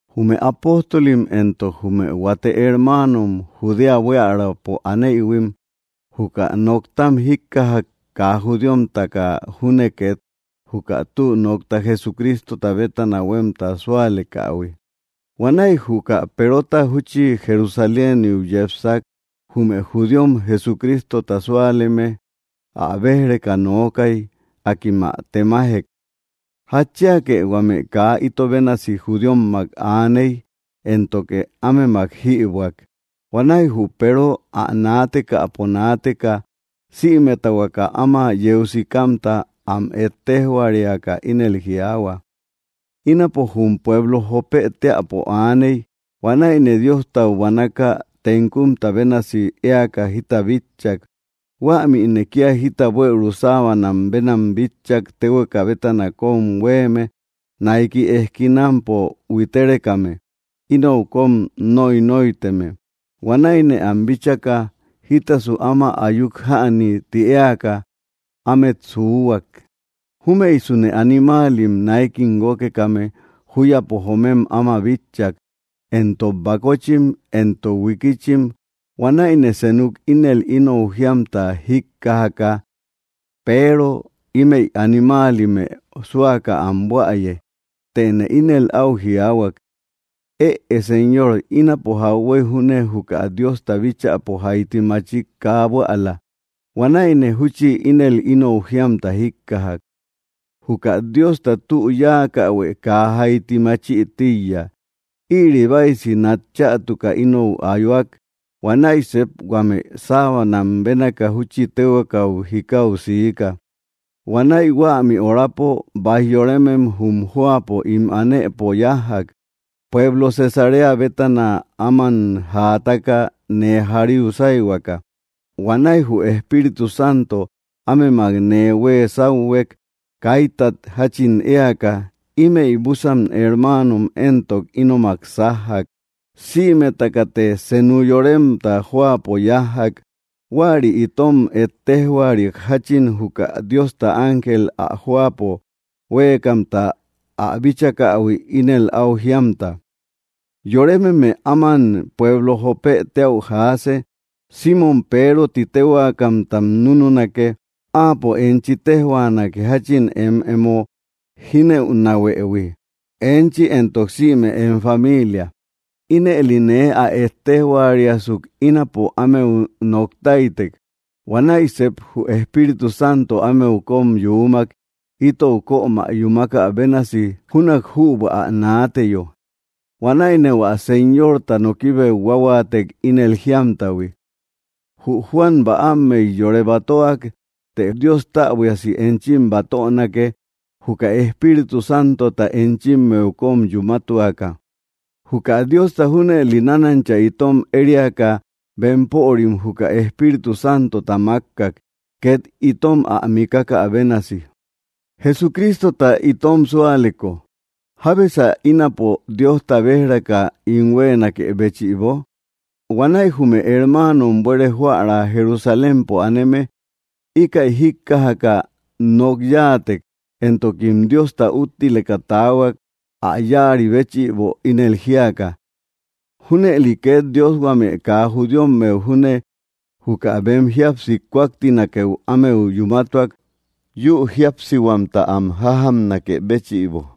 Jume apóstolim, éntok jume huate hermáanom Judea buíaräpo anéïhuim, juka noktam jíkkajak kaa judíomtaka junne ket juka tü nokta Jesucrístota bétana huemta súalekähui. Huanäi juka Perota júchi Jerusaléniu yepsak, jume judíom Jesucrístota súaleme ä béj‑reka nookai. Akim ä temajek: —¿Jatchíake huame kaa ito bénasi judíommak aaney, éntoke ámemak jïbuäk? Huanäi jü Peero ä naatekäpo naateka sïmeta huaka áma yeu sikamta am ettéjhuariaka, ínel jiaahua: —Ínapo jum pueblo Jópë teäpo aaney, huanäine Diostau buanaka tenkumta bénasi éaka jita bitchak. Huämïne kia jita buëuru sábanam bénam bitchak téhueka bétana kom huéme, naiki eskinampo huitérekame, inou kom nóinoiteme. Huanäine am bíchaka jítasu áma ayuk jäni ti éaka ámet suúhuak. Júmëisune animáalim náikim guókekame júyapo joomem áma bitchak, éntok bakóchim, éntok huikíchim. Huanäine senuk ínel inou jíamta jíkkajaka: “Peero, ímeí animáalimë súaka am buäye.” Tëne ínel au jiaahuak: “Ëe Señor, ínapo jauhuey júne juka Diosta bíchäpo jaiti machik kaa buäla.” Huanäine júchi ínel inou jíamta jíkkajak: “Juka Diosta tü yákähuë kaa jaiti máchï tíiya.” Ïri báisi nat chätuka inou ayúak, huanäi sep huame sábanam bénaka júchi téhuekau jikáu siika. Huanäi huämi orapo baij yorémem jum jóapo ín anëpo yájjak, pueblo Cesarea bétana áman jaataka nee jaríu sáihuaka. Huanäi jü Espíritu Santo ámemak nee huee sáuhuek kaítat jachin éaka. Imey busan hermáanom éntok, ínomak sájjak. Sïmetakate senu yoremta jóapo yájjak. Huäri itom ettéjhuariak jachin juka Diosta ángel ä jóapo huéekamta ä bíchakähui ínel au jíamta: “Yorémeme áman pueblo Jópë téäu jaase. Simmom Peero ti téhuakamtam núnunake. Áapo enchi téjhuanake jachin em emo jínëunahuëhui, enchi éntok sïme em familia.” Ínëli nee ä ettéjhuariasuk, ínapo ámeu noktáitek. Huanäi sep jü Espíritu Santo ámeu kom yuumak itou kömä yúmakä bénasi júnak jübua ä naateyo. Huanäine hua Señorta nokibeu huáhuaatek ínel jíamtahui: “Jü Juan bäammey yore batöak, të Dios täbuiasi enchim batönake juka Espíritu Santota enchimmeu kom yumátuaka.” Juka Diosta junëli nánancha itom ériaka bempörim juka Espíritu Santota makkak, ket itom ä mikakä bénasi Jesucrístota itom súaleko, ¿jábesa ínapo Diosta béj‑reka ín huéenakë béchïbo? Huanäi jume hermáanom buere joära Jerusalémpo aneme íkäi jíkkajaka nok yáatek, éntokim Diosta úttileka taahuak ä yáari béchïbo ínel jiaka: —¡Júnëli ket Dios huame kaa judíommeu júne juka bem jíapsi kúaktinakeu ámeu yumátuak yu jíapsihuamta am jájamnakë béchïbo!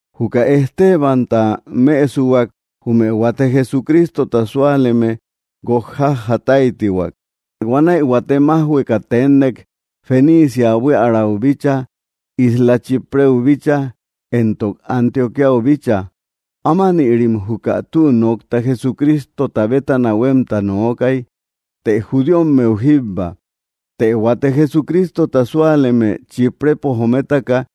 Juka Estebanta mësuak jume huate Jesucrístota súaleme guok jájataitiak. Huanäi huate maujhueka ténnek Fenícia buiärau bícha, isla Chipreu bícha, éntok Antioquíau bícha. Ámanïrim juka tü nokta Jesucrístota bétana huemta nookai, teé judíommeu jíbba. Të huate Jesucrístota súaleme Chíprepo jométaka,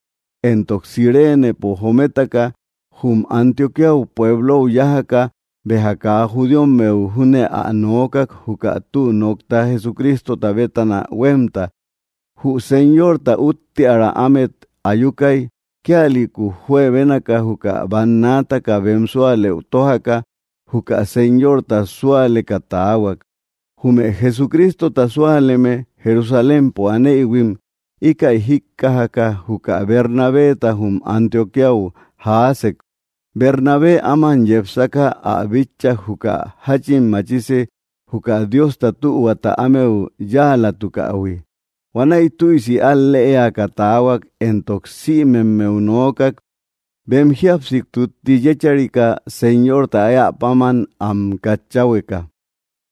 éntok Cirénepo jométaka, jum Antioquía pueblou yájaka béja kaa judíommeu júne ä noókak juka tü nokta Jesucrístota bétana huemta. Jü Señorta uútteara ámet ayukai, kíalïku juebénaka juka bannaataka bem súalëu tójaka juka Señorta súaleka taahuak. Jume Jesucrístota súaleme Jerusalémpo anéïhuim íkäi jíkkajaka juka Bernabeta jum Antioquíau jaasek. Bernabé áman yepsaka ä bitchak juka jachin machisi juka Diosta tühuata ámeu yáalatukähui. Huanäi tüisi al-léaka taahuak, éntok sïmemmeu noókak bem jíapsi tutti yécharika Señorta éä páman am katchahueka.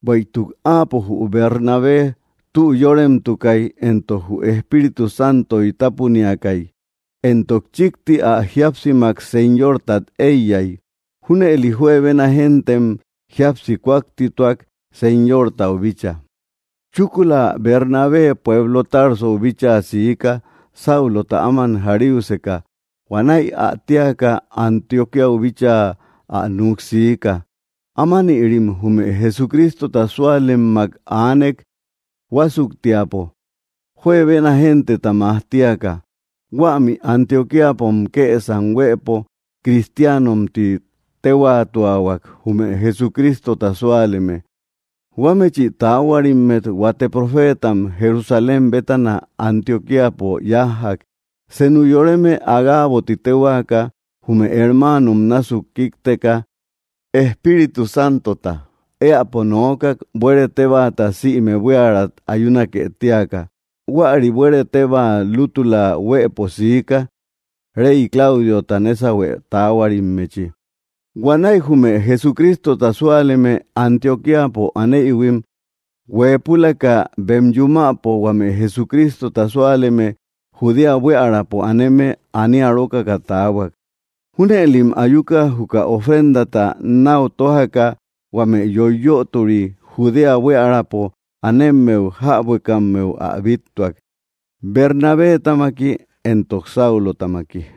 Bueïtuk áapo, jü Bernabé, tü yóremtukai, éntok jü Espíritu Santoy tapuniakai, éntok chikti ä jíapsimak Señortat éiyay. Júnëli juebena géntem jíapsi kúaktituak Señortau bícha. Chúkula Bernabé pueblo Tarsou bíchaa siika Sáulota áman jaríuseka. Huanäi ä téaka Antioquíau bíchaa ä nuk siika. Ámanïrim jume Jesucrístota súalemmak aanek huásuktiapo, juebena genteta majtíaka. Huämi Antioquíapom kësam huëpo cristiánom ti téhuatuahuak jume Jesucrístota súaleme. Huámechi taáhuarimmet huate profétam Jerusalém bétana Antioquíapo yájjak. Senu yoreme Agabo ti téhuaka, jume hermáanom násuk kíkteka, Espíritu Santota éäpo noókak buere tébaata sïme buíarat ayúnake tíaka. Huäri buere teba lútula huëpo siika rey Claudiota nésauhuë taáhuarimmechi. Huanäi jume Jesucrístota súaleme Antioquíapo anéïhuim, hueepulaka bem yumäpo, huame Jesucrístota súaleme Judéa buiärapo aneme anía rókaka taahuak. Júnëlim ayuka, juka ofrendata nau tójaka huame yoiyöturi Judéa buiärapo anemmeu jäbuekammeu ä bíttuak Bernabétamaki éntok Saulotamaki.